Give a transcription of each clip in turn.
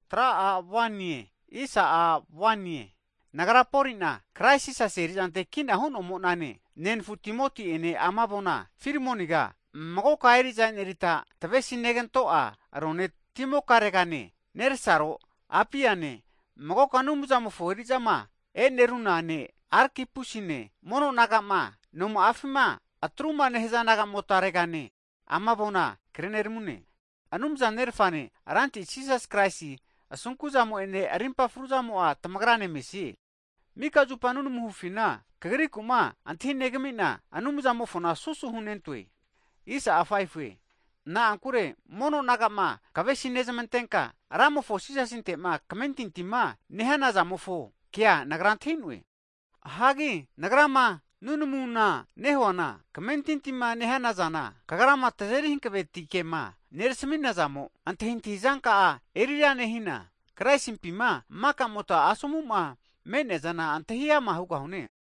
Hagi nagra Poli'na, Krais Jisasi erizante kina hu'nomo'nane, nenafu Timoti'ene ama avona, Filimoniga magoka eri'za enerita tavesinegantona rone timokaregane, nersaro Apiane, magoka Anumzamofo eri'zama e'neruna ne' Arkipusine mono naga'ma, nonka'afima atruma nehaza nagamotaregane ama avona kreneramune. Anumza Nerfane Ranti Jisas Kraisi asunku'zamo'ene arimpa fruzamo'a tamagrane mesie. Mika zupa nunamuma hufina, kagriku'ma antahinegami'na, Anumzani'amofona susu hunentoe. Na'ankure mono naga'ma kavesinezmantenka, Ramofo Jisasinte'ma kamentintima nehana zamofo kea, nagra antahi'noe. Hagi nagrama nunamuma nehuana, kamentintima nehana zana kagrama tazeri hanavetikema nerasamina zamo'a, antahintahizanka'a erira nehina, Kraisimpima makamota asomu'ma me'neazana antahi ama hugahane.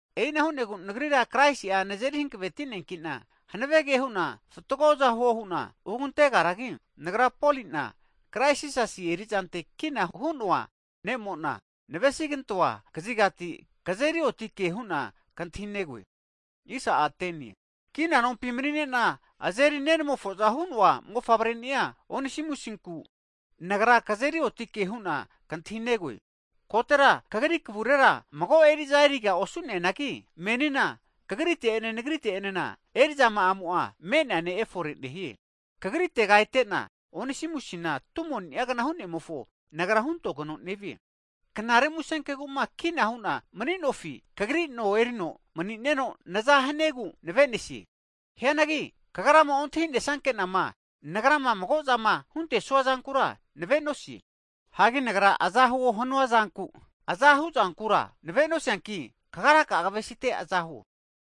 E'ina hu'negu, nagrira Kraisi'a nazeri hanaveti'neankina hanave ke hu'na fatgoza huo hu'na hugantegaragi, Nagra Poli'na, Krais Jisasi erizante kina hu'noa ne'mona, navesigantoa kazigati, kazeri otike huna kantahinegoe. Kina nompi mani'nena azeri nenamofoza hu'noa mofavreni'a Onisimusinku, nagra kazeri otike hu'na kantahi'negoe. Kotera kagri kavurera mago eri'za eriga osu'neanagi, menina kagrite'ene nagrite'enena, eri'zama'amo'a me'nea ne' efore nehie. Hagi kagritega etena, Onisimusina tumoni'agna hu'nemofo nagra huntogeno nevie. Knare Musenkegu'ma kina hu'na maninofi, kagri no erino manineno naza haniegu navenesie. Hianagi kagrama ontahinesanke'nama, nagrama mago'zama huntesua zankura navenosie. Hagi nagra aza huo hanuazanku, aza hu'zankura navenosianki, kagraka'a kavesite aza huo.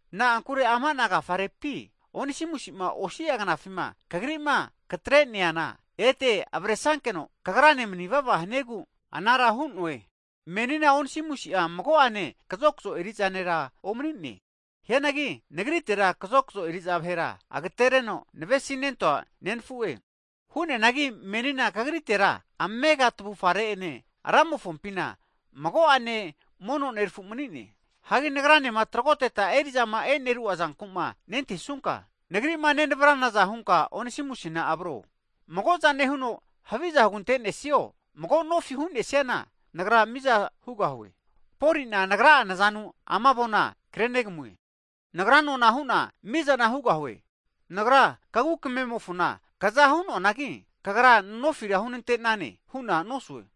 Na'ankure amana agafarepi Onisimusima osia knafima kagri'ma katreneana, ete avresankeno kagrane manivava haniegu anara hu'ne. Menina Onisimusia mago'ane kazokzo eri'za nera omanine. Hianagi nagritera kazokzo eri'za vahera agatereno navesinentoa nenfu'e. Hu'neanagi menina kagritera amega tavufare'ene Ramofompina mago'ane mono nerafu manine Hagi nagranema tragoteta eri'zama e'neru'a zanku'ma nentahisunka, nagri'ma nenavranaza hunka Onisimusina avro. Mago'za nehuno haviza hugantenesio, mago nofi hu'nesiana nagra miza hugahue. Poli'na Nagra'a nazanu ama avona krenegamue. Nagra nona hu'na mizana hugahue. Nagra kagu kamemofona kaza hunoanagi, kagra nofira hunantenane hu'na nosue.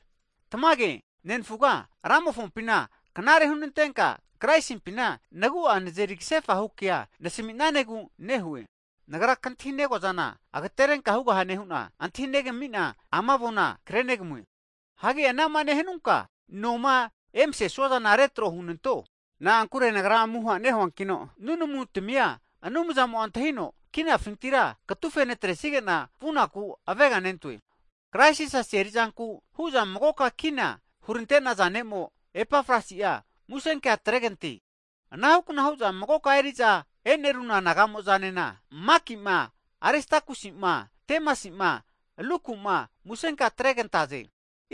Tamage nenfuga, Ramofompina knare hunantenka, Kraisimpina nagu'a nazeri kasefahu kea nasami'nanegu nehue. Nagra kantahi'negoazana, agaterenka hugahane hu'na antahinegamina, ama avona krenegamue. Hagi anama nehanunka noma emasesuazana retro hunanto, na'ankure nagra amuha nehuankino, nunamu tamia Anumzamo'a antahino, kinafintira katufe natresagena vu'naku aveganentoe. Hagi Krais Jisasi eri'zanku hu'za magoka kina hurante'naza ne'mo, Epafrasi'a musenkea atregante. Anahukna hu'za magoka eri'za eneruna naga'mo'zanena, Makima Aristakusima, Demasima, Luku'ma, musenkea atregantaze.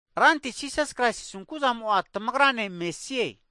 Ranti Jisas Kraisi asunku'zamo'a tamagrane mesie.